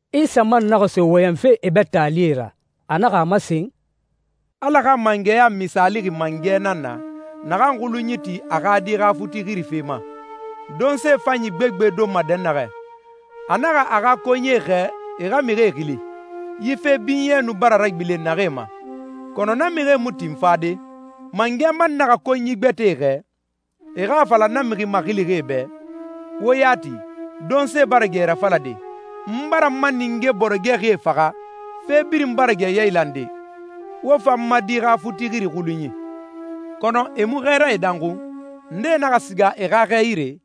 Isa man naxa so wɔyɛnfe e bɛ taalie ra. A naxa a masen, «Ala xa mangɛya misaalixi mangɛ nan na, naxan xulunyi ti a xa di xa futi xirife ma, donse fanyi gbegbe donma dɛnnaxɛ. A naxa a xa konyie xɛɛ e xa mixie xili, yi fe binyɛ nu bara ragbilen naxee ma, kɔnɔ na mixie mu tin fade. Mangɛ man naxa konyi gbɛtɛe xɛɛ, e xa a fala na mixi maxilixie bɛ, ‹Wo ya ti, donse bara gɛ rafalade, n bara n ma ninge bɔrɔgɛxie faxa, fe birin bara gɛ yailande. Wo fa n ma di xa futixiri xulunyi.› Kɔnɔ e mu xɛɛrae danxun. Ndee naxa siga e xa xɛ yire,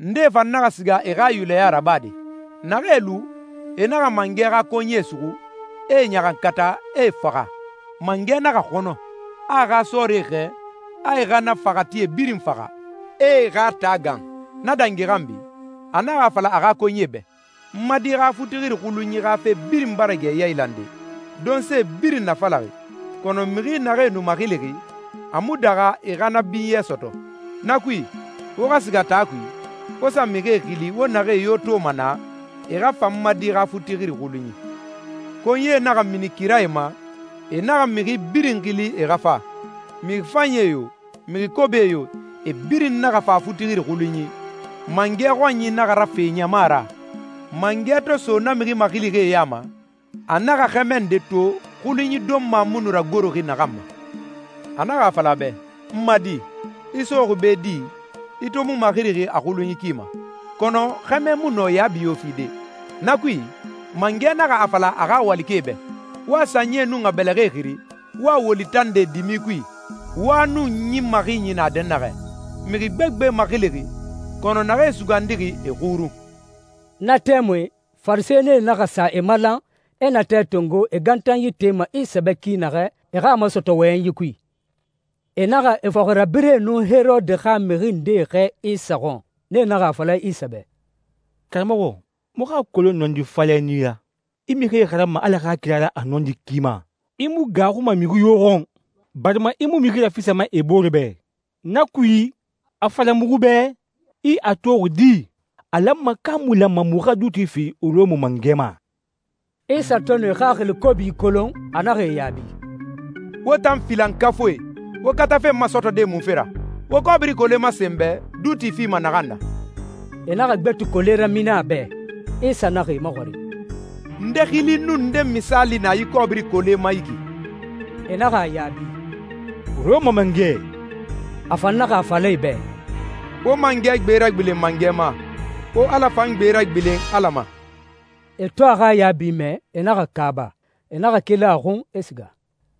ndee fan naxa siga e xa yulɛya rabade. Naxee lu, e naxa mangɛ xa konyie suxu, e e ɲaxankata, e e faxa.» «Mangɛ naxa xɔnɔ, a a xa sɔɔrie xɛɛ, a e xa na faxatie birin faxa, e e xa taa gan. Na dangi xanbi, a naxa a fala a xa konyie bɛ, ‹N ma di xa futixiri xulunyi xa fe birin bara gɛ yailande. Donsee birin nafalaxi, kɔnɔ mixi naxee nu maxilixi, a mu daxa e xa na binyɛ sɔtɔ. Na kui, wo xa siga taa kui, wo sa mixie xili wo naxee yo toma naa, e xa fa n ma di xa futixiri xulunyi.› Konyie naxa mini kirae ma, e naxa mixi birin xili e xa fa. Mixi fanyi yo, mixi kobi yo, e birin naxa fa futixiri xulunyi, mangɛ xɔnyi naxa rafe ɲama ra.» «Mangɛ to so na mixi maxilixie ya ma, a naxa xɛmɛ nde to xulunyi donma mu nu ragoroxi naxan ma. A naxa a fala a bɛ, ‹N ma di, i soxi be di, i to mu maxirixi a xulunyi ki ma?› Kɔnɔ xɛmɛ mu nɔ yaabi yo fide. Na kui, mangɛ naxa a fala a xa walikɛe bɛ, ‹Wo a sanyie nun a bɛlɛxɛe xiri, wo a woli tande dimi kui, wa nun ɲin maxinyi na dɛnnaxɛ.› Mixi gbegbe maxilixi, kɔnɔ naxee sugandixi, e xurun.» Na tɛmui, Farisɛnie naxa sa e malan, e natɛ tongo e gantanyi tema Isa bɛ ki naxɛ, e xa a masɔtɔ wɔyɛnyi kui. E naxa e fɔxirabirɛe nun Herode xa mixi ndee xɛɛ Isa xɔn. Nee naxa a fala Isa bɛ, «Karamɔxɔ, muxu a kolon nɔndi falɛ nan i ra. I mixie xaranma Ala xa kira ra a nɔndi ki ma. I mu gaaxuma mixi yo xɔn, barima i mu mixi rafisama e booree bɛ. Na kui, a fala muxu bɛ, i a toxi di? A lanma ka a mu lanma muxu xa duuti fi Rɔma mangɛ ma?» Isa to nu e xaxili kobi kolon, a naxa e yaabi, «Wo tan filankafuie, wo katafe n masɔtɔde munfe ra? Wo kɔbiri kole masen n bɛ duuti fima naxan na.» E naxa gbeti kole ramini a bɛ. Isa naxa e maxɔrin, «Nde xili nun nde misaali na yi kɔbiri kole ma yi ki?» E naxa a yaabi, «Rɔma Mangɛ.» A fan naxa a fala e bɛ, «Wo mangɛ gbe ragbilen mangɛ ma, wo Ala fan gbe ragbilen Ala ma.» E to a xa yaabi mɛ, e naxa kaaba. E naxa keli a xun, e siga.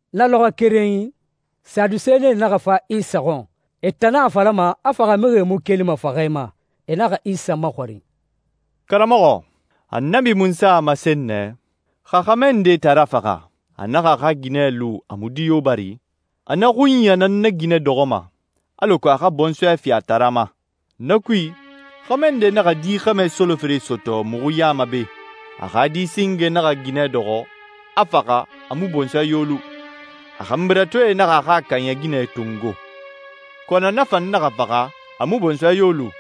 Na lɔxɔɛ kerenyi, Sadusenie naxa fa Isa xɔn. E tan nan a falama a faxamixie mu kelima faxɛ ma. E naxa Isa maxɔrin, «Karamɔxɔ, Annabi Munsa a masen nɛ, ‹Xa xɛmɛ nde taara faxa, a naxa a xa ginɛ lu a mu di yo bari, a na xunya nan na ginɛ dɔxɔma, alako a xa bɔnsɔɛ fi a taara ma.› Na kui, xɛmɛ nde naxa di xɛmɛ solofere sɔtɔ muxu ya ma be. A xa di singe naxa ginɛ dɔxɔ, a faxa, a mu bɔnsɔɛ yo lu. A xanbiratoe naxa a xa kaaɲɛ ginɛ tongo, kɔnɔ na fan naxa faxa, a mu bɔnsɔɛ yo lu.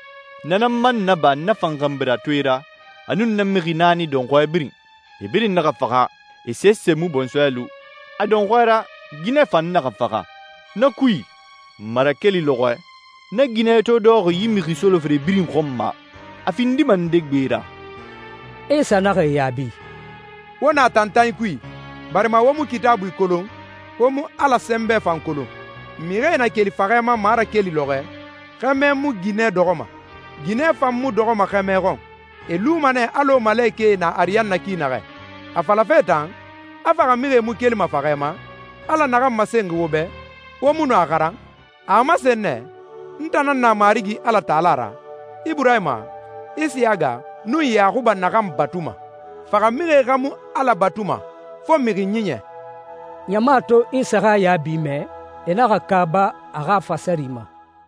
Na nan man naba na fan xanbiratoe ra, a nun na mixi naani dɔnxɔɛ birin. E birin naxa faxa, e sese mu bɔnsɔɛ lu. A dɔnxɔɛ ra, ginɛ fan naxa faxa. Na kui, marakeli lɔxɔɛ, na ginɛ to dɔxɔxi yi mixi solofere birin xɔn ma, a findima nde gbe ra?» Isa naxa e yaabi, «Wo na tantanyi kui, barima wo mu Kitaabui kolon, wo mu Ala sɛnbɛ fan kolon. Mixie na keli faxɛ ma marakeli lɔxɔɛ, xɛmɛ mu ginɛ dɔxɔma, ginɛ fan mu dɔxɔma xɛmɛ xɔn. E luma nɛ alɔ malekɛe na ariyanna ki naxɛ. A falafe tan, a faxamixie mu kelima faxɛ ma, Ala naxan masen wo bɛ, wo mu nu a xaran? A a masen nɛ, ‹N tan nan na Marigi Alatala ra, Iburahima, Isiyaga, nun Yaxuba naxan batuma.› Faxamixie xa mu Ala batuma, fo mixi ɲiɲɛ.» Ɲama to Isa xa yaabi mɛ, e naxa kaaba a xa fasari ma.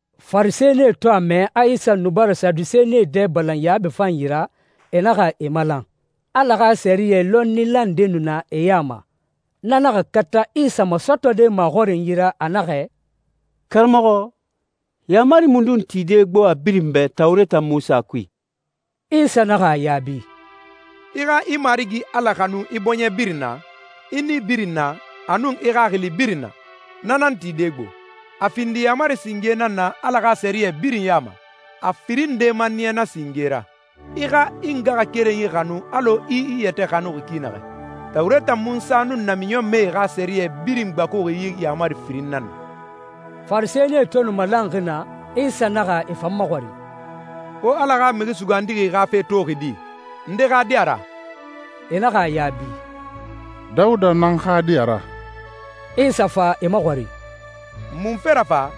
Farisɛnie to a mɛ a Isa nu bara Sadusenie dɛ balan yaabi fanyi ra, e naxa e malan. Ala xa sɛriyɛ lɔnnila nde nu na e ya ma. Na naxa kata Isa masɔtɔde maxɔrinyi ra, a naxɛ, «Karamɔxɔ, yaamari mundun tide gbo a birin bɛ Tawureta Munsa kui?» Isa naxa a yaabi, «‹I xa i Marigi Ala xanu i bɔɲɛ birin na, i nii birin na, a nun i xaxili birin na.› Na nan tide gbo, a findi yaamari singe nan na Ala xa sɛriyɛ birin ya ma. A firin nde maniya na singe ra, ‹I xa i ngaxakerenyi xanu alɔ i i yɛtɛ xanuxi ki naxɛ.› Tawureta Munsa nun namiɲɔnmɛe xa sɛriyɛ birin gbakuxi yi yaamari firin nan na.» Farisɛnie to nu malanxi naa, Isa naxa e fan maxɔrin, «Wo Ala xa Mixi Sugandixi xa fe toxi di? Nde xa di a ra?» E naxa a yaabi, «Dawuda nan xa di a ra.» Isa fa e maxɔrin, «Munfe ra fa,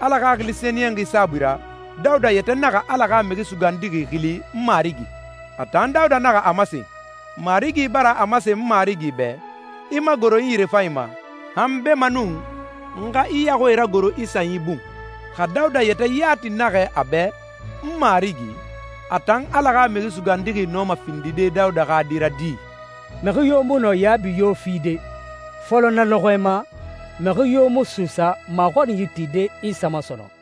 Ala Xaxili Sɛniyɛnxi saabui ra, Dawuda yɛtɛ naxa Ala xa Mixi Sugandixi xili ‹N Marigi›? A tan Dawuda naxa a masen, ‹Marigi bara a masen n Marigi bɛ, “I magoro n yirefanyi ma, han beemanun n xa i yaxuie ragoro i sanyi bun.”›» «Xa Dawuda yɛtɛ yati naxɛ a bɛ ‹N Marigi›, a tan Ala xa Mixi Sugandixi nɔma findide Dawuda xa di ra di?» Mixi yo mu nɔ yaabi yo fide. Fɔlɔ na lɔxɔɛ ma, mixi yo mu suusa maxɔrinyi tide Isa ma sɔnɔn.